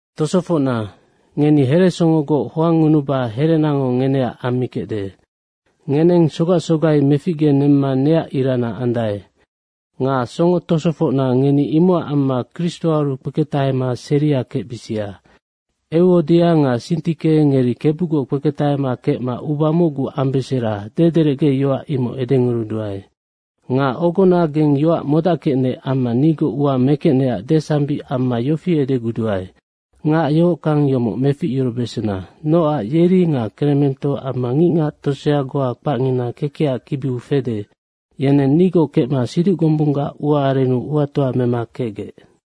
Tosofocna, ngeni heresongogoc hoangngunuba herenango ngeneac ammikecde. Ngeneng sogac sogai meficgenemma neac irana andae. Nga songo tosofocna, ngeni imocac amma Kristoaru kpeketahama seria kecbisia. Euodia nga Sintike, ngeri Kebugoc kpeketahema kecma uba mocgu ambesera, dederecgeyoac imoc edenguruduae. Nga ogona geng yoac modackecnec amma nigoc ua mekecnecac desambic amma yofi edeguduae, ngac yohockang yomoc meficyurubesena. Nocac yeri nga Kremento amma ngicngac tosea goa kpacngina kekecac kibiu fede, yeneng nigoc kecma siduc gombunggac ua arennu uatoa mema kecgec.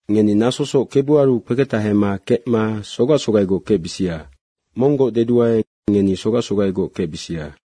Ngeni nasosoc Kebuaru kpeketahema kecma sogac sogaigoc kecbisia, monggoc deduae, ngeni sogac sogaigoc kecbisia.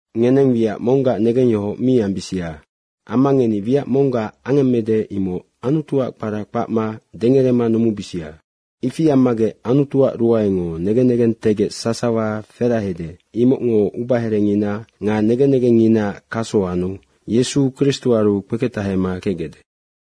Ngeneng wiac monggac negengyohoc mi ambisia. Amma ngeni wiac monggac angemmede, imoc Anutuac kpara kpacma dengerema numumibisia. Ifi ammagec Anutuac ruaengo negen negentegec sasawa ferahede, imocngo ubaherengina nga negen negengnginaac kaso anu Yesu Kristoaru kpeketahema kecgecde.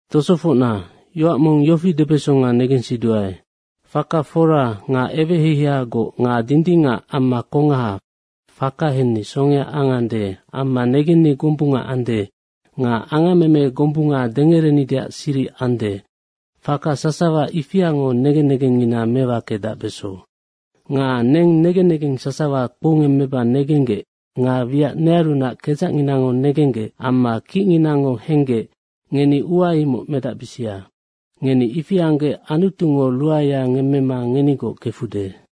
Tosofocna, yoac mong yofi debesonga negensiduae, faka fora nga eweheiheiagoc nga dindingac amma kongaha, faka henni songea angande amma negenni gombunga ande nga angammeme gombunga dengerenideac siric ande, faka sasawa ifiango negen negengngina mewakedacbeso. Nga neng negen negeng sasawa kpoungemmeba negenggec nga wiac nearunac kedzacnginango negenggec amma kicnginango henggec, ngeni ua imoc medacbisia. Ngeni ifi anggec Anutungo ruaea ngemmema ngenigoc kefude.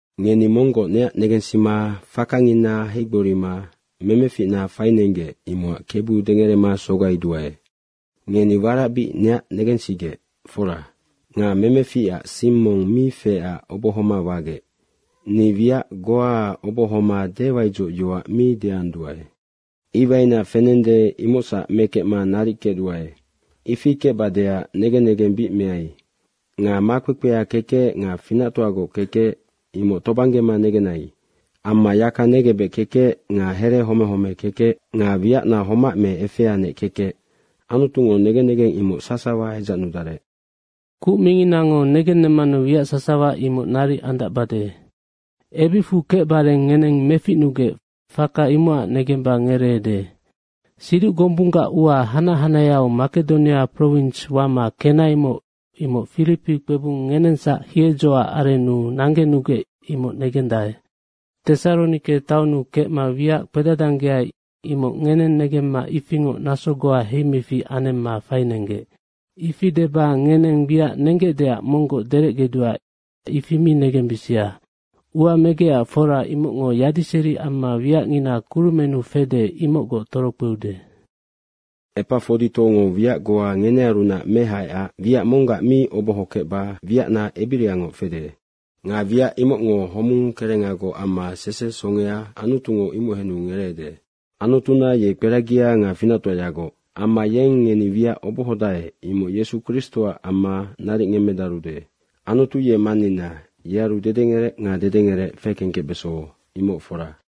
Ngeni monggoc neac negensima fakangina heigborima memeficna fainenggec, imocac Kebu dengerema sogaiduae. Ngeni warac bic neac negensigec, fora. Nga memeficac sing mong mi feecac obohoma wagec. Ni wiac goaac obohoma dewaidzocyoac mi deanduae. Iwaina fenende, imocsac mekecma naric kecduae. Ifi kecbadeac negen negeng bic meai. Nga makpekpea kekec nga finactoagoc kekec imoc tobanggema negenai. Amma yaka negebec kekec nga here home home kekec nga wiacna homac me efeanec kekec, Anutungo negen negeng imoc sasawa edzacnudarec. Kuc minginango negennemmanu wiac sasawa imoc naric andacbade. Ebicfu kecbareng ngeneng meficnugec, faka imocac negemba ngereede. Siduc gombunggac ua hanac hanaheau Makedonia prowins wama kenaimoc, imoc Firipi kpebung ngenengsac hiedzoac arennu nanggenugec, imoc negendae. Tesaronike taonnu kecma wiac kpedadanggeai, imoc ngeneng negemma ifingoc naso goa heimefic anemma fainenggec. Ifi deba ngeneng wiac nenggecdeac monggoc derecgeduae, ifi mi negembisia. Ua megecac fora, imocngo yadiseri amma wiacngina kurumennu fede imocgoc torokpeude. Epafoditongo wiac goa ngenearunac mehaecac wiac monggac mi oboho kecba wiacna ebiriangoc fede. Nga wiac imocngo homung kerengagoc amma sese songea, Anutungo imoc henu ngereede. Anutuna ye kperagia nga finactoayagoc. Amma yeng ngeni wiac obohodae, imoc Yesu Kristoac amma naric ngemmedarude. Anutu ye Mannina. Yearu dedengerec nga dedengerec fekengkecbeso, imoc fora.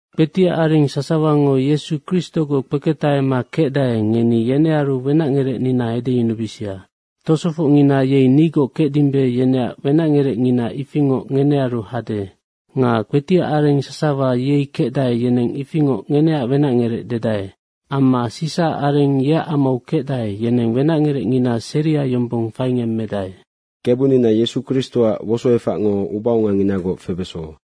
Kpetiac areng sasawango Yesu Kristogoc kpeketahema kecdae, ngeni yenearu wenacngerecnina edeyunubisia. Tosofocngina yei nigoc kecdimbe, yeneac wenacngerecngina ifingoc ngenearu hade. Nga kpetiac areng sasawa yei kecdae, yeneng ifingoc ngeneac wenacngerec dedae. Amma Sisaac areng yeac amau kecdae, yeneng wenacngerecngina seria yombong faingemmedae. Kebunina Yesu Kristoac wosoefacngo ubaonganginagoc febeso.